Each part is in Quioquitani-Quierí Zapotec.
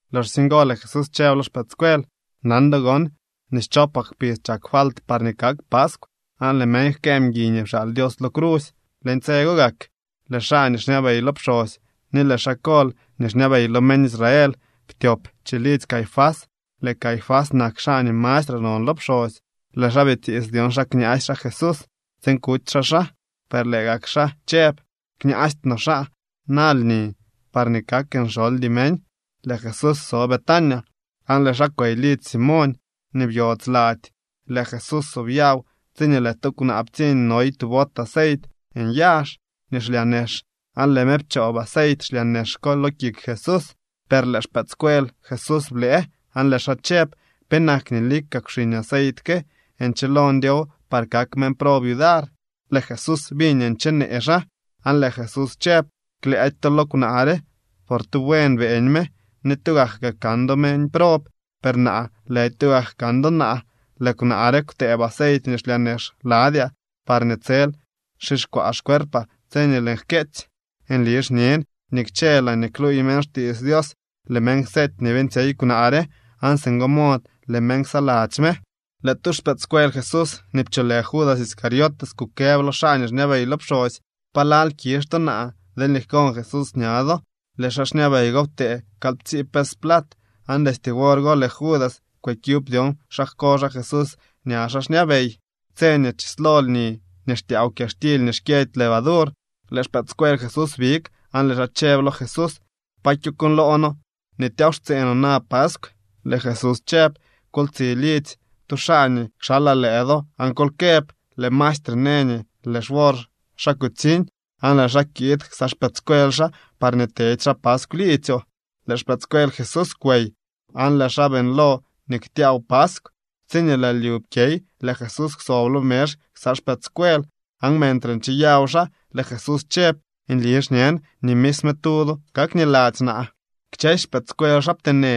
Loxsye ngo lëë Jesús chëb lo xpëëdscuel: —Nan do gon nii schopak kpidz chak falt parñee kak paskw, aan lëë meñ jkëë mguiy nii pxaal Dios lo crusy. Leñ tse go gak lëë xaa nii xñabey lo pxosy ni lëë xaa kol nii xñabey lo meñ Israel ptyop chilidzy Caifás. Lëë Caifás nak xaa nii mastre non lo pxosy. Lëë xaa bitiits dyon xa kñaasy xaa Jesús tsiin kuty xaa xaa. Per lëë gak xaa chëb: —Kñaasty no xaa na lni parñee kak nxoldy meñ. Lëë Jesús so Betania, aan lëë xaa kwey lidzy Simoñ nii byodz lady. Lëë Jesús sobyaw tsiñee lëë tu kwnaa ptsiñ noy tu bot aceit nyazh nii xlyaa nex, aan lëë me pchoob aceit xlyaa nex ko lo kik Jesús. Per lëë xpëëdscuel Jesús blëë, aan lëë xaa chëb: —¿Penak nii lika kwxiñ aceit ke? Nchilo ndyow par kak meñ prob yudar. Lëë Jesús biñ nii nchenee xaa, aan lëë Jesús chëb: —Klëëdy to lo kwnaa re, por tu buen beeñ me. Ni tugak kaa kan do meñ prob, per naa lëdy tugak kan do naa. Lëë kwnaa re kwtëëb aceit nii xlyaa nex ladyaa parñee tsel xixkwaa xcuerpaa tse nii lëën jkyeetsy. Nli xñen nii kchë laañee kluuy meñ xtiits Dios, lëë meñ kseety nii beeñtsyey kwnaa re, aan singo mod lëë meñ ksaladzy me. Lëë tu xpëëdscuel Jesús nii pcholë Judas Iscariote kukëb lo xaa nii xñabey lo pxosy: —¿Pa lal kizh to naa deelñee jkon Jesús ña do? Lëë xaa xñabey go ptee kalyptsii pes plat. Aan destye wor go lëë Judas kwëkyub dyon xa jko xaa Jesús ña xaa xñabey. Tse nii chislo lni nii xtyaaw kyaxtily nii xkyëdy levadur, lëë xpëëdscuel Jesús big aan lëë xaa chëb lo Jesús: —¿Pa kyokuuñloo noo nii tyaaw xtsee no na paskw? Lëë Jesús chëb: —Kol tsi lidzy tu xaa nii kxalaa lëë do aan kol këb: “Lëë maestre në nii lëë xwor xaa kutsiñ, aan lëë xaa kiid ksa xpëëdscuel xaa parñee tedy xaa paskw liidzyoo.” Lëë xpëëdscuel Jesús kwey, aan lëë xaa beeñlo nii ktyaaw paskw. Tsiñee lëë lyu pkyey, lëë Jesús kwsob lo mezh ksa xpëëdscuel. Aan mentre ncheyaw xaa, lëë Jesús chëb: —Nli xñen nii misme tu do kakniladzy naa. Kchësy xpëëdscuel xaa pteenë,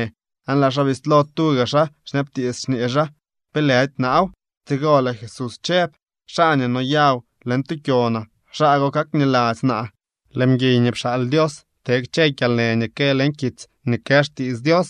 aan lëë xaa bislo tuga xaa xñabtiits, xñee xaa: —¿Pe lëdy naaw? Tsigo lëë Jesús chëb: —Xaa nii noyaw leñ tu kyonaa, xaa go kakniladzy naa. Lëë mguiy nii pxaal Dios te kchë kyalnë nii kë leñ kitsy nii kë xtiits Dios.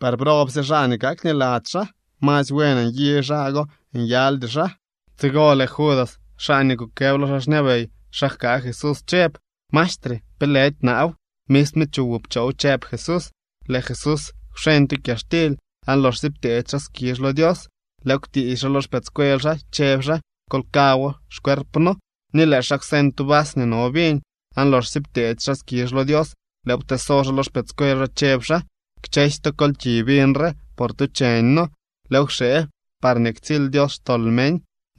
Per ¡brobsye xaa nii kakniladzy xaa! Masy buen nyi xaa go nyaldy xaa. Tsigo lëë Judas, xaa nii kukëb lo xaa xñabey xa jkaa Jesús chëb: —Maestre, ¿pe lëdy naaw? —Misme chuwoo pchoow —chëb Jesús. Lëë Jesús kwxeñ tu kyaxtily, aan loxsye pteedy xaa skizh lo Dios, lëëw kwtiisy xaa lo xpëëdscuel xaa, chëb xaa: —Kol kaawoo, xcuerpno. Ni lëë xaa kwseñ tu vas nii no viñ, aan loxsye pteedy xaa skizh lo Dios, lëëw pteeso xaa lo xpëëdscuel xaa, chëb xaa: —Kchësy to, kol ki viñ re, por tu cheñno. Lëëw kxee parñee ktsily Dios xtol meñ.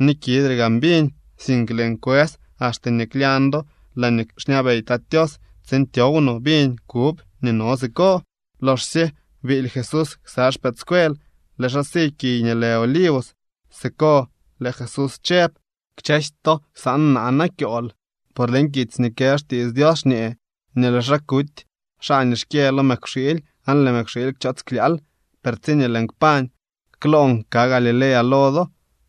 Ni kidre gaan viñ, sink lëën kwës axte nii klyañ do laañee xñabey Tat Tios tsiin tyow no viñ kub nii no siko. Loxsye biily Jesús ksa xpëëdscuel, lëë xaa si kiy nii lë Olivos. Siko lëë Jesús chëb: —Kchësy to ksaan naa na kyool. Por leñ kitsy nii kë xtiits Dios xñee nii lëë xaa kuty xaa nii xkyë lo mëkwxiily aan lëë mëkwxiily kchoots klyaal. Per tsiñee lëën kpañ, kloon ka Galilea lo do.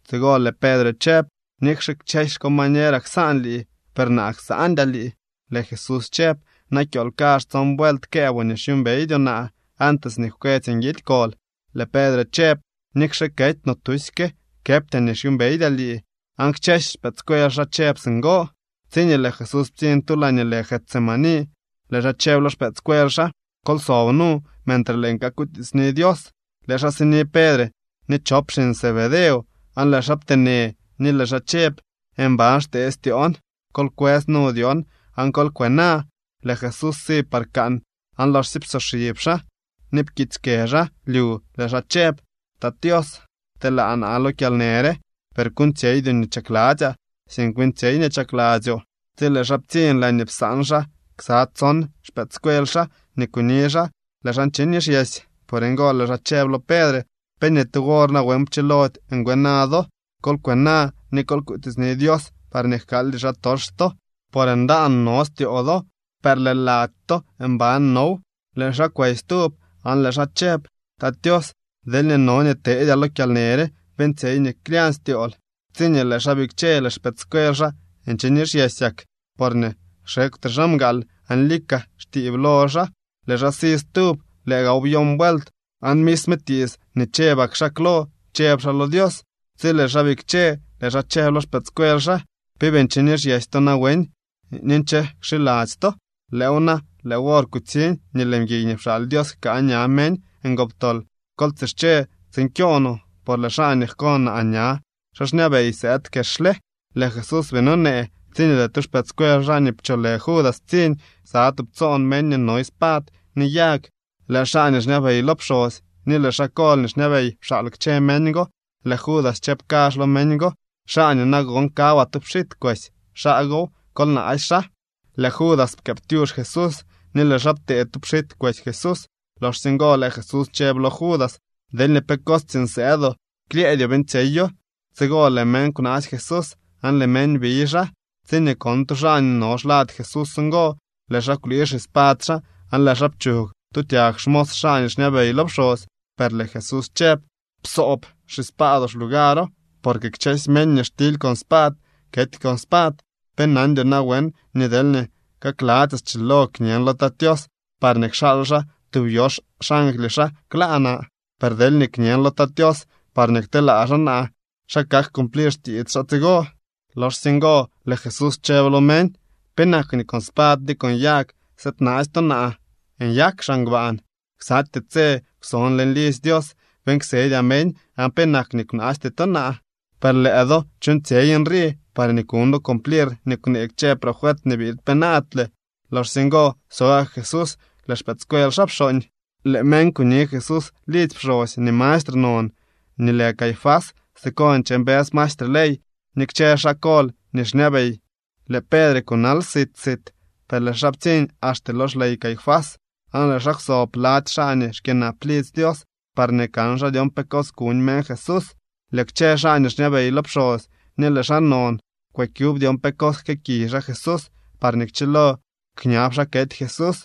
Tsigo lëë Pedre chëb: —Nikxe kchësy xcombañeraa ksaan lii, per naa ksandyaa lii. Lëë Jesús chëb: —Na kyool kazh tson vuelt këëboo nii xyuumbeydyoo naa antes nii jkwetsy nguidy kol. Lëë Pedre chëb: —Nikxe kety no tusyke, këbtyaa nii xyuumbeydyaa lii. Aan kchësy xpëëdscuel xaa chëb singo. Tsiñee lëë Jesús ptsiñ tu laañee lë Getsemaní, lëë xaa chëb lo xpëëdscuel xaa: —Kol sob nu, mentre lëën kakutiitsni Dios. Lëë xaa sini Pedre ni chop xiñ Zebedeo, aan lëë xaa pteenë, ni lëë xaa chëb: —Mban xtee styoon. Kol kwës nu dyon, aan kol kwena. Lëë Jesús si par kaan, aan loxsye psoxib xaa ni pkiitsy kë xaa lyu lëë xaa chëb: —Tat Tios, pteelaa naa lo kyalnë re, per kuuñtsyeydyoo nii chakladzyaa, sink beeñtsyey nii chakladzyoo. Tsi lëë xaa ptsiñ laañee psaan xaa ksa tson xpëëdscuel xaa nii kuni xaa, lëë xaa nche nixyesy. Por ngo lëë xaa chëb lo Pedre: —¿Pe ni tu wor nawen pchilody ngwena do? Kol kwena ni kol kutiitsni Dios parñee jkaaldy xaatox to, por ndaan no styoo do, per lëë lady to mban now. Lëë xaa kwey stub, aan lëë xaa chëb: —Tat Tios, deelñee no nii teedyaa lo kyalnë re, beeñtsyey nii klyañ styool. Tsiñee lëë xaa bikche, lëë xpëëdscuel xaa nche nixyesyak, porñee xekwtre xaa mgaal aan lika xtiib lo xaa. Lëë xaa si stub. Lëë gaaw byon vuelt, aan misme tiits nii chëbak xaa klo chëb xaa lo Dios. Tsi lëë xaa bikche, lëë xaa chëb lo xpëëdscuel xaa: —¿Pe bii nche nixyesy to nawen ni nche kxiladzy to? Lëëw na, lëë wor kutsiñ nii lëë mguiy nii pxaal Dios jkaa ña meñ ngoptol. Kol tsische tsiin kyoo no, por lëë xaa nii jko naa ña xaa xñabey sëëd kexle. Lëë Jesús bii nonee tsiñee lëë tu xpëëdscuel xaa nii pcholë Judas ptsiñ ksa tubtsoon meñ nii noy spad ni yag. Lëë xaa nii xñabey lo pxosy ni lëë xaa kol nii xñabey pxaal kchë meñ go. Lëë Judas chëb kazh lo meñ go: —Xaa nii nagon kawaa tu pxit kwesy, xaa gow. Kol naasy xaa. Lëë Judas pkëëptyux Jesús, ni lëë xaa ptee tu pxit kwesy Jesús. Loxsye ngo lëë Jesús chëb lo Judas: —Deelñee pe cos tsiiñ sëëdoo, klyëëdyoo beeñtsyeyo. Tsigo lëë meñ kwnaasy Jesús aan lëë meñ biy xaa. Tsiñee kon tu xaa nii no xlad Jesús ngo, lëë xaa kwlii xispad xaa aan lëë xaa pchug tu tyag xmos xaa nii xñabey lo pxosy. Per lëë Jesús chëb: —Psoob xispaadoo xlugaro. Porque kchësy meñ nii xtily con spad, kety con spad. ¿Pe nandyoo nawen nii deelñee kakladzyaa schilo kñen lo Tat Tios parñee kxaal xaa tub yox xangly xaa kla naa? Per deelñee kñen lo Tat Tios parñee kteelaa xaa naa, ¿xa kak cumplir xtiits xaa tsigo? Loxsye ngo lëë Jesús chëb lo meñ: —¿Penak nii con spad ni con yag sëëdnaasy to naa nyak xaa ngbaan? Ksatyee tse kwson leñ lidzy Dios beeñ ksedyaa meñ aan penak nii kwnaasty to naa. Per lëë do chuuñtsyey nrii parñee kuñ do cumplir nii kwnee kchë profet nii biid penaadle. Loxsye ngo so gak Jesús lëë xpëëdscuel xaa pxooñ. Lëë meñ kuni Jesús lidzy pxosy nii mastre non nii lë Caifás. Siko nche mbës maestre ley ni kchë xaa kol nii xñabey. Lëë Pedre kunal sit sit, per lëë xaa ptsiñ axte lo xley Caifás aan lëë xaa kwsob lady xaa nii xkyënap lidzy Dios parñee kan xaa dyon pe cos kuñ meñ Jesús. Lëë kchë xaa nii xñabey lo pxosy ni lëë xaa non kwëkyub dyon pe cos jkëëkiy xaa Jesús parñee kchilo kñab xaa kety Jesús.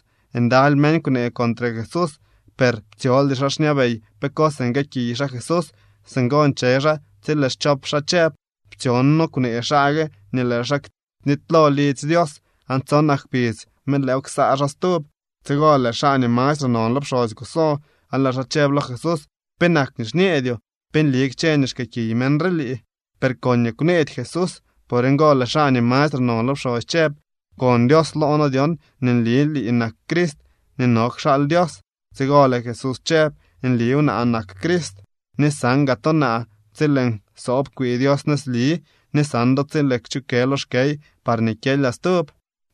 Ndaly meñ kwnee contre Jesús, per ptsyoldy xaa xñabey pe cos nguëëkiy xaa Jesús. Singo nche xaa tsi lëë schop xaa chëb: —Ptsyon noo kwnee xaa gue nii lëë xaa knitylo lidzy Dios, aan tsonak kpidz me lëëw ksaa xaa stub. Tsigo lëë xaa nii mastre non lo pxosy kuso, aan lëë xaa chëb lo Jesús: —¿Penak nii xñeedyoo? ¿Pe nli kchë nii xkëëkiy meñ re lii? Per koñee kwneedy Jesús. Por ngo lëë xaa nii mastre non lo pxosy chëb: —Pkon Dios loo noo dyon, nii nli lii nak Crist nii no kxaal Dios. Tsigo lëë Jesús chëb: —Nliw, naa nak Crist, ni san gaa to naa tsi lëën soob kwi Dios nëzli, ni san do tsi lëën kchukë lo xkey parñee kyelyaa stub.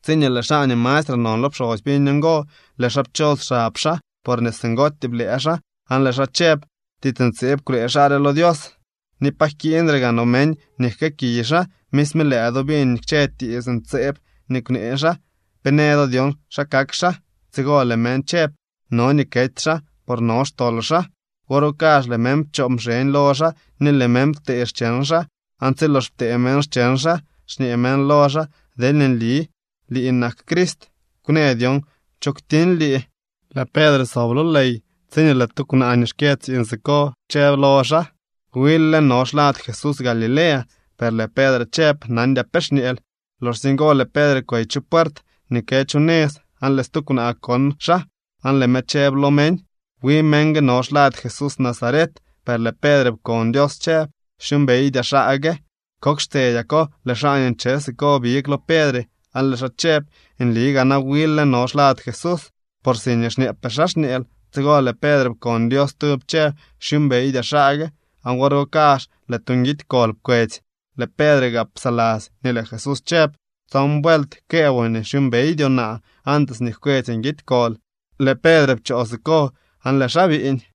Tsiñee lëë xaa nii mastre non lo pxosy biñ ngo, lëë xaa pchos xab xaa, porñee singootyee blëë xaa, aan lëë xaa chëb: —Tiits ntseeb kwnee xaa re lo Dios, ni ¿pa jkiiñre gaa no meñ nii jkëëkiy xaa? Misme lëë do biñ kchë tiits ntseeb nii kwnee xaa. ¿Pe në do dyon xa kak xaa? Tsigo lëë meñ chëb: —No nii kety xaa, por no xtol xaa. Wor go kazh lëë meñ pchoo mxeñ lo xaa ni lëë meñ ptee xcheñ xaa. Aan tsi lox ptee meñ xcheñ xaa, xñee meñ lo xaa: —Deelñee nli lii nak Crist, ¡kwnë dyon cho kwtiñ lii! Lëë Pedre sob lo ley, tsiñee lëë tu kwnaa nii xkyë tsiiñ siko chëb lo xaa: —Wil lë no xlad Jesús Galilea. Per lëë Pedre chëb: —Nandyaa pe xñeel. Loxsye ngo lëë Pedre kwey chu puert nii kë chu nëz, aan lëë stu kwnaa kon xaa aan lëë me chëb lo meñ: —Wi meñ gue no xlad Jesús Nazaret. Per lëë Pedre pkon Dios chëb: —Xyuumbeydyaa xaa gue. Kok xtsedyako, lëë xaa nii nche siko big lo Pedre aan lëë xaa chëb: —Nli gaa na wil lë no xlad Jesús, por si xñeepee xaa xñeel. Tsigo lëë Pedre pkon Dios stub chëb: —Xyuumbeydyaa xaa gue. Aan wor go kazh lëë tu nguidy kol pkwetsy. Lëë Pedre gaa psaladzy nii lëë Jesús chëb: “Tson vuelt këëboo nii xyuumbeydyoo naa antes nii jkwetsy nguidy kol.” Lëë Pedre pchoo siko aan lëë xaa biiñ.